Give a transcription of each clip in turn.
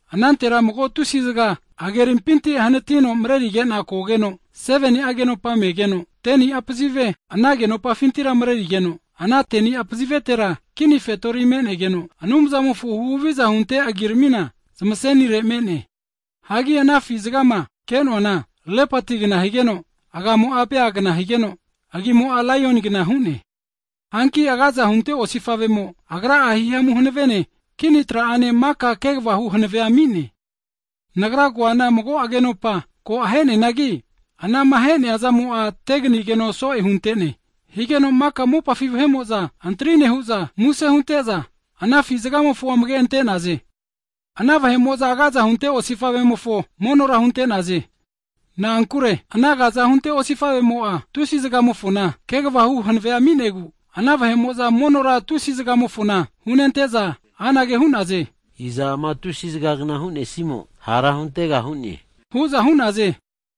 Anantera mago afi zga hagerimpinti hanatino mrerige'na kogeno, 7ni'a agenopa megeno, 10ni'a pazive ana agenopafintira mrerigeno, ana 10'a pazivetera kini fetori menegeno, Anumzamofo huhaviza hunte agiramina zmasenire me'ne. Hagi ana afi zgama ke'noana lepatigna higeno, agamo'a bea agagna higeno, agi'mo'a laioni agikna hu'ne. Hanki agaza hunte tusi osifavemo agra'a hihamu hanavene, kini tra'ane maka kegvahu hanavea ami'ne. Nagra koana mago agenopa ko aheneanagi, anama ahe'nea zamo'a teganigeno so'e huntene. Higeno maka mopafi vahe'mo'za antri nehu'za, muse hunte'za, ana afi zgamofo amage ante'naze. Ana vahe'mo'za agaza hunte osifavemofo monora hunte'naze. Na'ankure ana agaza hunte osifavemo'a, afi zgamofona kegvahu hanavea ami'negu, ana vahe'mo'za monora tusi zgamofona hunente'za anage hu'naze, iza ama tusi zgagna hu'nesimo hara huntega hu'ne? hu'za hu'naze.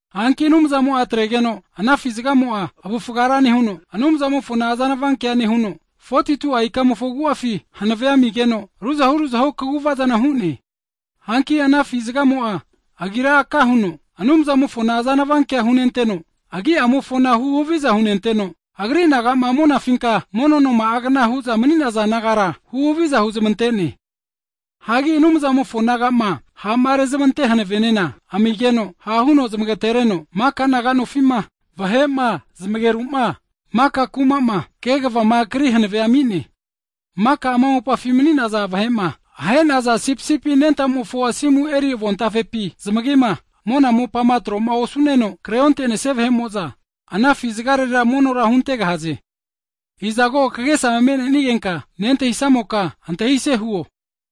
Hanki Anumzamo'a atregeno, ana afi zgamo'a avufga ra nehuno, Anumzamofona azanava kea nehuno, 42'a ikamofo agu'afi hanavea amigeno ruzahu ruzahu kaguvazana hu'ne. Hanki ana afi zgamo'a agira aka huno, Anumzamofona azanava kea hunenteno, Agi'amofona huhaviza hunenteno, Agri nagama monafinka mono noma'agna hu'za mni'naza nagara, huhaviza huzmante'ne. Hagi Anumzamofo nagama ha'marezmante hanavenena amigeno, hahu zmagatenereno, maka naga nofima, vahe'ma, zmageruma maka kumama, kegvama kri hanave ami'ne. Maka ama mopafi mni'naza vahe'ma, ahe'naza Sipisipi Anentamofo asimu eri avontafepi zmagima, monane mopanema tro'ma osu'neno kre ontenesia vahe'mo'za, ana afi zgarera monora huntegahaze. Izago kagesa me'nenigenka nentahisamoka, antahise huo.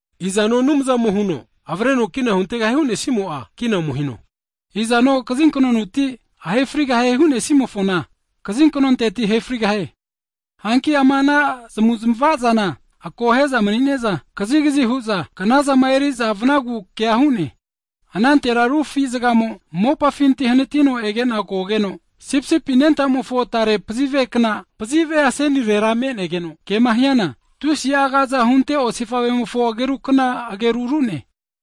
Izano Anumzamo huno avreno kina huntegahie hunesimo'a, kina ome hino. Izano kazinknonteti ahefrigahie hunesimofona kazinknonteti ahefrigahie. Hanki ama ana zmavu'zmavazana akohe'za mni'neza kazigazi hu'za knazama eri'za vnagu kea hu'ne! Anantera ru afi zgamo mopafinti hanatino egena kogeno, sipisipi anentamofo tare pazivekna pazive asenirera me'negeno, kema hiana tusi'a agaza hunte osifavemofo agerukna ageru ru'ne.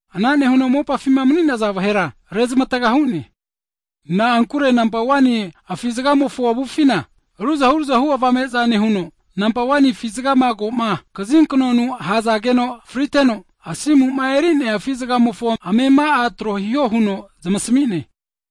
Ana nehuno mopafima mni'naza vahera rezmataga hu'ne, na'ankure nampa 1ni afi zgamofo avufina, ruzahu ruzahu avame'za nehuno, nampa 1ni afi zgama koma kazinknonu ahazageno friteno asimuma erinea afi zgamofo amema'a tro hiho huno zmasami'ne.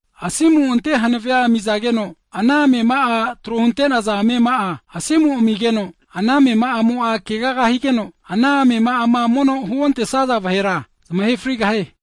Asimu'ante hanave amizageno, ana amema'a tro hunte'naza amema'a asimu amigeno, ana amema'amo'a keaga higeno, ana amema'ama mono huontesaza vahera zmahe frigahie.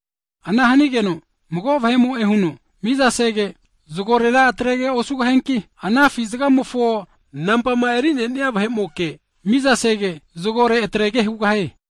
Ana hanigeno mago vahe'mo'e huno mizasege, zgorera atrege osugahianki, ana afi zgamofo agimofo nampama erinenia vahe'moke mizasege, zgore atrege hugahie.